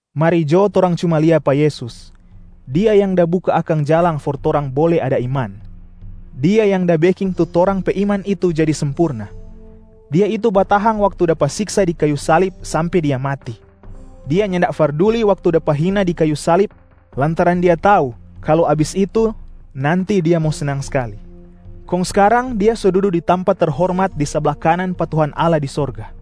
Mari jo torang cuma lia pa Yesus, Dia yang da buka akang jalang for torang bole ada iman, Dia yang da beking tu torang pe iman itu jadi sempurna. Dia itu batahang waktu dapa siksa di kayu salib sampe Dia mati, Dia nyanda farduli waktu dapa hina di kayu salib lantaran Dia tau kalu abis itu nanti Dia mo snang skali. Kong skarang Dia so dudu di tampa terhormat di sabla kanan pa Tuhan Allah di sorga.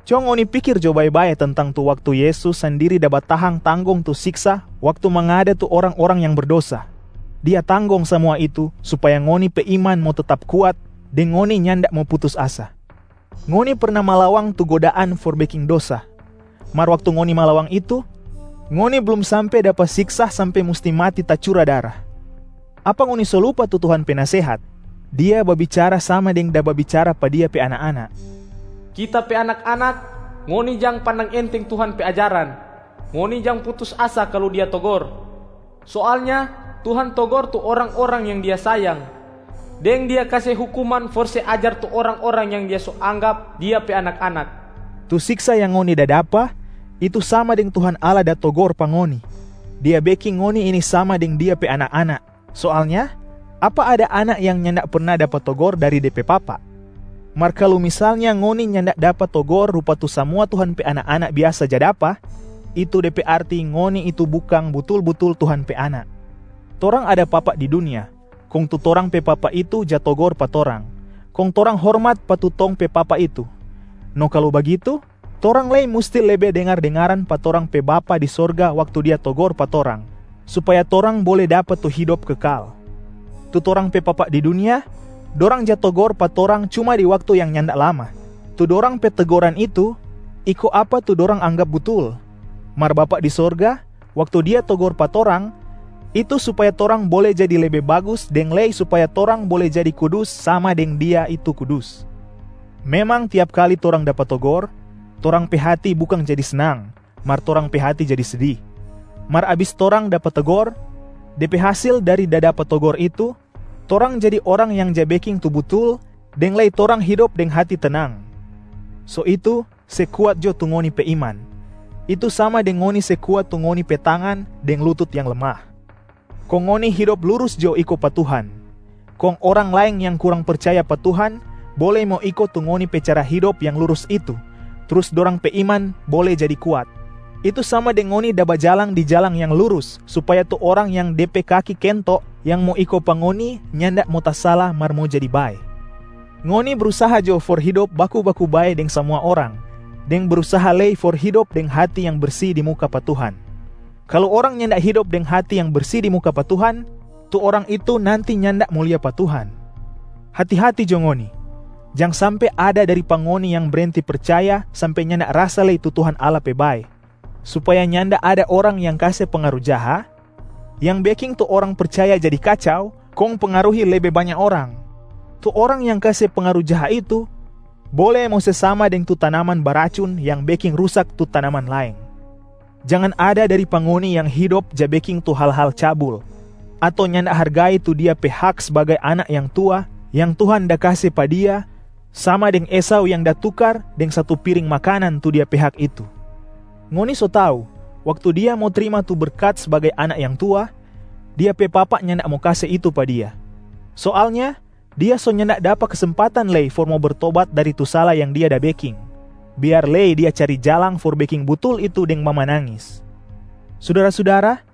Co ngoni pikir jo bae-bae tentang tu waktu Yesus sandiri da batahang tanggong tu siksa waktu mangada tu orang-orang yang berdosa, Dia tanggong samua itu supaya ngoni pe iman mo tetap kuat deng ngoni nyanda mo putus asa. Ngoni perna malawang tu godaan for beking dosa, mar waktu ngoni malawang itu, ngoni blum sampe dapa siksa sampe musti mati tacura dara. Apa ngoni so lupa tu Tuhan pe nasehat? Dia babicara sama deng da babicara pa Dia pe anak-anak, “Kita pe anak-anak, ngoni jang pandang enteng Tuhan pe ajaran! Ngoni jang putus asa kalu Dia togor. Soalnya Tuhan togor tu orang-orang yang Dia sayang, deng Dia kase hukuman for se ajar tu orang-orang yang Dia so anggap Dia pe anak-anak.” Tu siksa yang ngoni da dapa itu sama deng Tuhan Allah da togor pa ngoni, Dia beking ngoni ini sama deng Dia pe anak-anak. Soalnya apa ada anak yang nyanda perna dapa togor dari de pe papa? Mar kalu misalnya ngoni nyanda dapa togor rupa tu samua Tuhan pe anak-anak biasa ja dapa, itu de pe arti ngoni itu bukang butul-butul Tuhan pe anak. Torang ada papa di dunia kong tu torang pe papa itu ja togor pa torang, kong torang hormat pa tu tong pe papa itu. No kalu bagitu, torang lei musti lebe dengar-dengaran pa torang pe Bapa di sorga waktu Dia togor pa torang, supaya torang bole dapa tu hidop kekal. Tu torang pe papa di dunia, dorang ja togor pa torang cuma di waktu yang nyanda lama. Tu dorang pe tegoran itu iko apa tu dorang anggap butul. Mar Bapa di sorga, waktu Dia togor pa torang, itu supaya torang bole jadi lebe bagus deng lei supaya torang bole jadi kudus sama deng Dia itu kudus. Memang tiap kali torang dapa togor, torang pe hati bukang jadi snang mar torang pe hati jadi sedi. Mar abis torang dapa togor, de pe hasil dari da dapa togor itu: torang jadi orang yang ja beking tu butul deng lei torang hidop deng hati tenang. So itu se kuat jo tu ngoni pe iman, itu sama deng ngoni se kuat tu ngoni pe tangan deng lutut yang lemah. Kong ngoni hidop lurus jo iko pa Tuhan, kong orang laeng yang kurang percaya pa Tuhan bole mo iko tu ngoni pe cara hidop yang lurus itu trus dorang pe iman bole jadi kuat, itu sama deng ngoni da bajalang di jalang yang lurus supaya tu orang yang de pe kaki kento yang mo iko pa ngoni nyanda mo tasala mar mo jadi bae. Ngoni brusaha jo for hidop baku-baku bae deng samua orang deng brusaha lei for hidop deng hati yang bersi di muka pa Tuhan. Kalu orang nyanda hidop deng hati yang bersi di muka pa Tuhan, tu orang itu nanti nyanda mo lia pa Tuhan. Hati-hati jo ngoni, jang sampe ada dari pa ngoni yang brenti percaya sampe nyanda rasa lei tu Tuhan Allah pe bae, supaya nyanda ada orang yang kase pengaru jaha yang beking tu orang percaya jadi kacau kong pengaruhi lebe banya orang. Tu orang yang kase pengaru jaha itu bole mo se sama deng tu tanaman baracun yang beking rusak tu tanaman laeng. Jangan ada dari pa ngoni yang hidop ja beking tu hal-hal cabul ato nyanda hargai tu dia pe hak sbagai anak yang tua yang Tuhan da kase pa dia sama deng Esau yang da tukar deng satu piring makanan tu dia pe hak itu. Ngoni so tau waktu dia mo trima tu berkat sbagai anak yang tua, dia pe papa nyanda mo kase itu pa dia. Soalnya dia so nyanda dapa kesempatan lei for mo bertobat dari tu sala yang dia da beking, biar lei dia cari jalang for beking butul itu deng mamanangis. Sudara-sudara,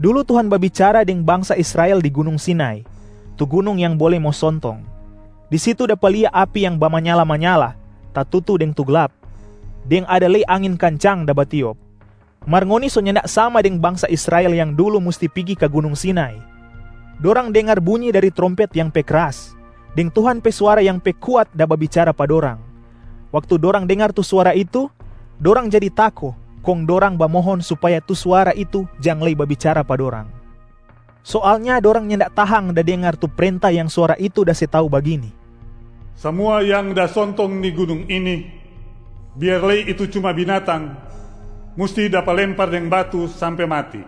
dulu Tuhan babicara deng bangsa Israel di gunung Sinai, tu gunung yang bole mo sontong. Di situ dapa lia api yang bamanyala-manyala, tatutu deng tu glap, deng ada lei angin kancang da batiop. Mar ngoni so nyanda sama deng bangsa Israel yang dulu musti pigi ka gunung Sinai. Dorang dengar bunyi dari trompet yang pe kras, deng Tuhan pe suara yang pe kuat da babicara pa dorang. Waktu dorang dengar tu suara itu, dorang jadi tako kong dorang bamohon supaya tu suara itu jang lei babicara pa dorang. Soalnya dorang nyanda tahang da dengar tu prenta yang suara itu da se tau bagini, “Samua yang da sontong ni gunung ini, biar lei itu cuma binatang, musti dapa lempar deng batu sampe mati.”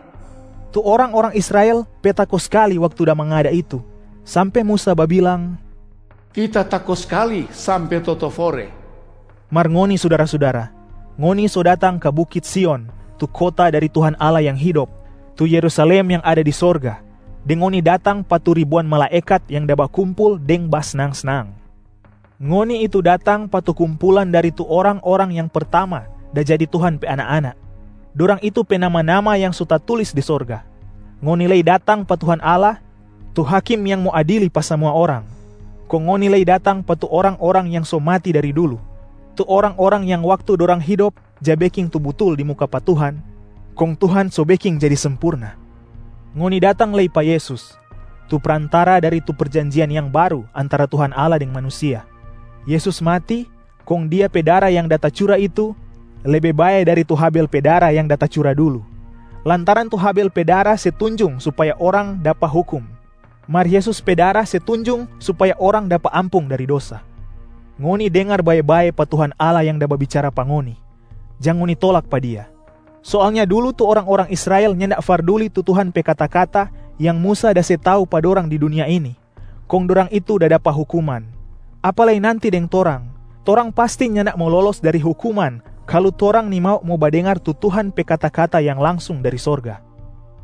Tu orang-orang Israel pe tako skali waktu da mangada itu, sampe Musa babilang, “Kita tako skali sampe totofore.” Mar ngoni sudara-sudara, ngoni so datang ka Bukit Sion tu kota dari Tuhan Allah yang hidop, tu Yerusalem yang ada di sorga deng ngoni datang pa tu ribuan malaekat yang da bakumpul deng basnang-snang. Ngoni itu datang pa tu kumpulan dari tu orang-orang yang pertamaa da jadi Tuhan pe anak-anak, dorang itu pe nama-nama yang so tatulis di sorga. Ngoni lei datang pa Tuhan Allah, tu Hakim yang mo adili pa samua orang. Kong ngoni lei datang pa tu orang-orang yang so mati dari dulu, tu orang-orang yang waktu dorang hidop ja beking tu butul di muka pa Tuhan kong Tuhan so beking jadi sempurna. Ngoni datang lei pa Yesus, tu Prantara dari tu perjanjian yang baru antara Tuhan Allah deng manusia. Yesus mati, kong Dia pe dara yang da tacura itu lebe bae dari tu Habel pe dara yang da tacura dulu, lantaran tu Habel pe dara se tunjung supaya orang dapa hukum, mar Yesus pe dara se tunjung supaya orang dapa ampung dari dosa. Ngoni dengar bae-bae pa Tuhan Allah yang da babicara pa ngoni, jang ngoni tolak pa Dia. Soalnya dulu tu orang-orang Israel nyanda farduli tu Tuhan pe kata-kata yang Musa da se tau pa dorang di dunia ini, kong dorang itu da dapa hukuman. Apa lei nanti deng torang, torang pasti nyanda mo lolos dari hukuman kalu torang nimau mo badengar tu Tuhan pe kata-kata yang langsung dari sorga.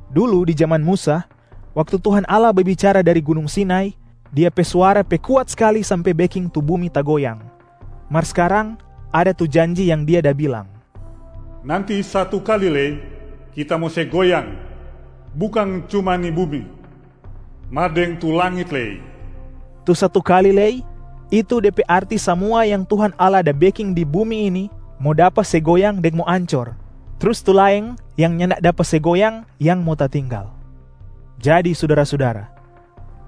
Dulu di jaman Musa, waktu Tuhan Allah babicara dari gunung Sinai, Dia pe suara pe kuat skali sampe beking tu bumi tagoyang. Mar skarang, ada tu janji yang Dia da bilang, “Nanti satu kali lei Kita mo se goyang bukang cuma ni bumi, mar deng tu langit lei.” Tu “satu kali lei,” itu de pe arti samua yang Tuhan Allah da beking di bumi ini mo dapa se goyang deng mo ancor, trus tu laeng yang nyanda dapa se goyang yang mo tatinggal. Jadi sudara-sudara,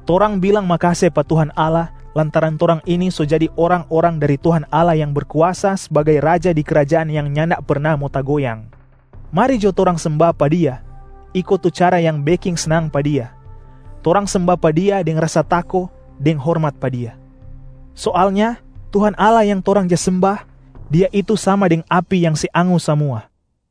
torang bilang makase pa Tuhan Allah lantaran torang ini so jadi orang-orang dari Tuhan Allah yang Berkuasa sbagai Raja di krajaan yang nyanda perna mo tagoyang. Mari jo torang semba pa Dia iko tu cara yang beking snang pa Dia, torang semba pa Dia deng rasa tako deng hormat pa Dia. Soalnya Tuhan Allah yang torang ja semba, Dia itu sama deng api yang se angus samua.